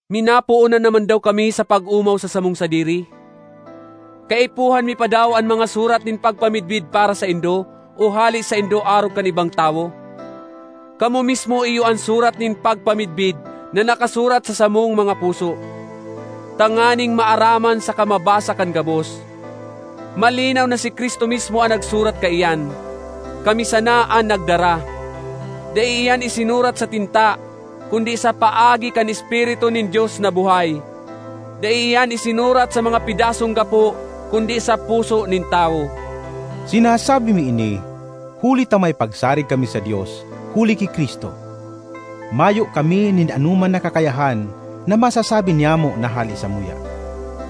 Minapoon na naman daw kami sa pag-omaw sa samong sadiri? Kaipuhan mi pa daw an mga surat nin pagpamidbid para saindo o hale saindo arog kan ibang tawo? Kamo mismo iyo an surat nin pagpamidbid na nakasurat sa samong mga puso, tanganing maaraman saka mabasa kan gabos. Malinaw na si Cristo mismo an nagsurat kaiyan; kami sana an nagdara. Dai iyan isinurat sa tinta, kundi sa paagi kan Espiritu nin Dios na buhay; dai iyan isinurat sa mga pedasong gapo kundi sa puso nin tawo. Sinasabi mi ini huli ta may pagsarig kami sa Dios huli ki Cristo. Mayo kami nin anoman na kakayahan na masasabi nyamo na hale samuya,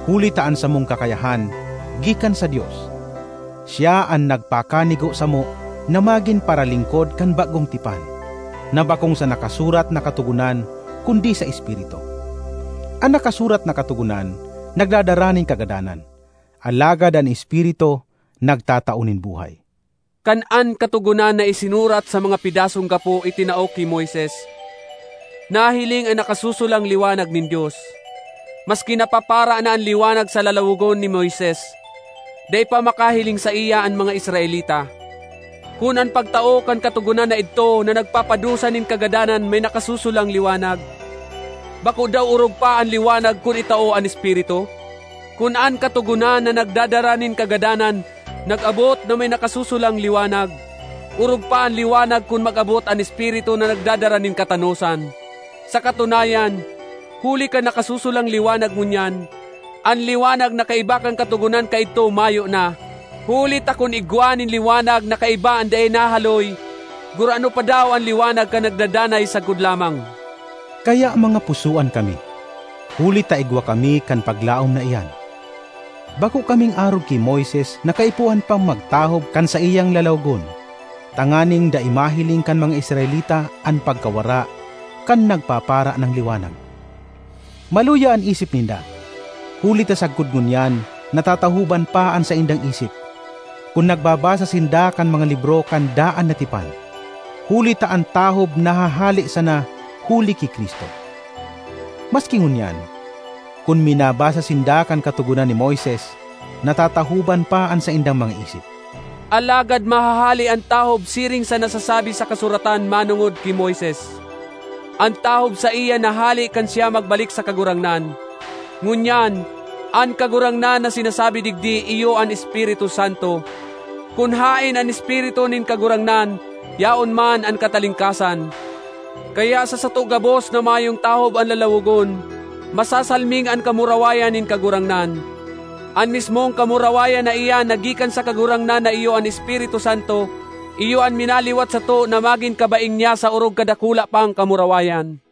huli ta an samong kakayahan gikan sa Dios. Siya an nagpakanigo samo na magin paralingkod kan bagong tipan, na bakong sa nakasurat na katogonan kundi sa Espiritu. An nakasurat na katogonan nagdadara nin kagadanan, alagad an Espiritu nagtatao nin buhay. Kan an Katogonan na isinurat sa mga pedasong gapo itinao ki Moises, nahiling an nakasusulang liwanag nin Dios; maski napapara na an liwanag sa lalawogon ni Moises, dai pa makahiling saiya an mga Israelita. Kun an pagtao kan Katogonan na idto na nagpapadusa nin kagadanan may nakasusulang liwanag, bako daw orog pa an liwanag kun itao an Espiritu? Kun an Katogonan na nagdadara nin kagadanan nag-abot na may nakasusulang liwanag, orog pa an liwanag kun mag-abot an Espiritu na nagdadara nin katanosan! Sa katunayan, huli kan nakasusulang liwanag ngunyan, an liwanag na kaiba kan Katogonan kaidto mayo na. Huli ta kun igwa nin liwanag na kaiba an dai nahaloy, gurano pa daw an liwanag kan nagdadanay sagkod lamang! Kaya mga pusoan kami, huli ta igwa kami kan paglaom na iyan. Bako kaming arog ki Moises na kaipuhan pang magtahob kan saiyang lalawogon tanganing dai mahiling kan mga Israelita an pagkawara kan nagpapara nang liwanag. Maluya an isip ninda, huli ta sagkod ngunyan natatahoban pa an saindang isip kun nagbabasa sinda kan mga libro kan daan na tipan. Huli ta an tahob nahahale sana huli ki Cristo. Maski ngunyan, kun minabasa sinda kan Katogonan ni Moises, natatahoban pa an saindang mga isip. Alagad mahahale an tahob siring sa nasasabi sa kasuratan manongod ki Moises: “An tahob saiya nahale kan siya magbalik sa Kagurangnan.” Ngunyan, “an Kagurangnan” na sinasabi digdi iyo an Espiritu Santo; kun haen an Espiritu nin Kagurangnan, yaon man an katalingkasan. Kaya sa sato gabos na mayong tahob an lalawogon masasalming an kamurawayan nin Kagurangnan; an mismong kamurawayan na iyan na gikan sa Kagurangnan na iyo an Espiritu Santo, iyo an minaliwat sato na magin kabaing niya sa orog kadakula pang kamurawayan.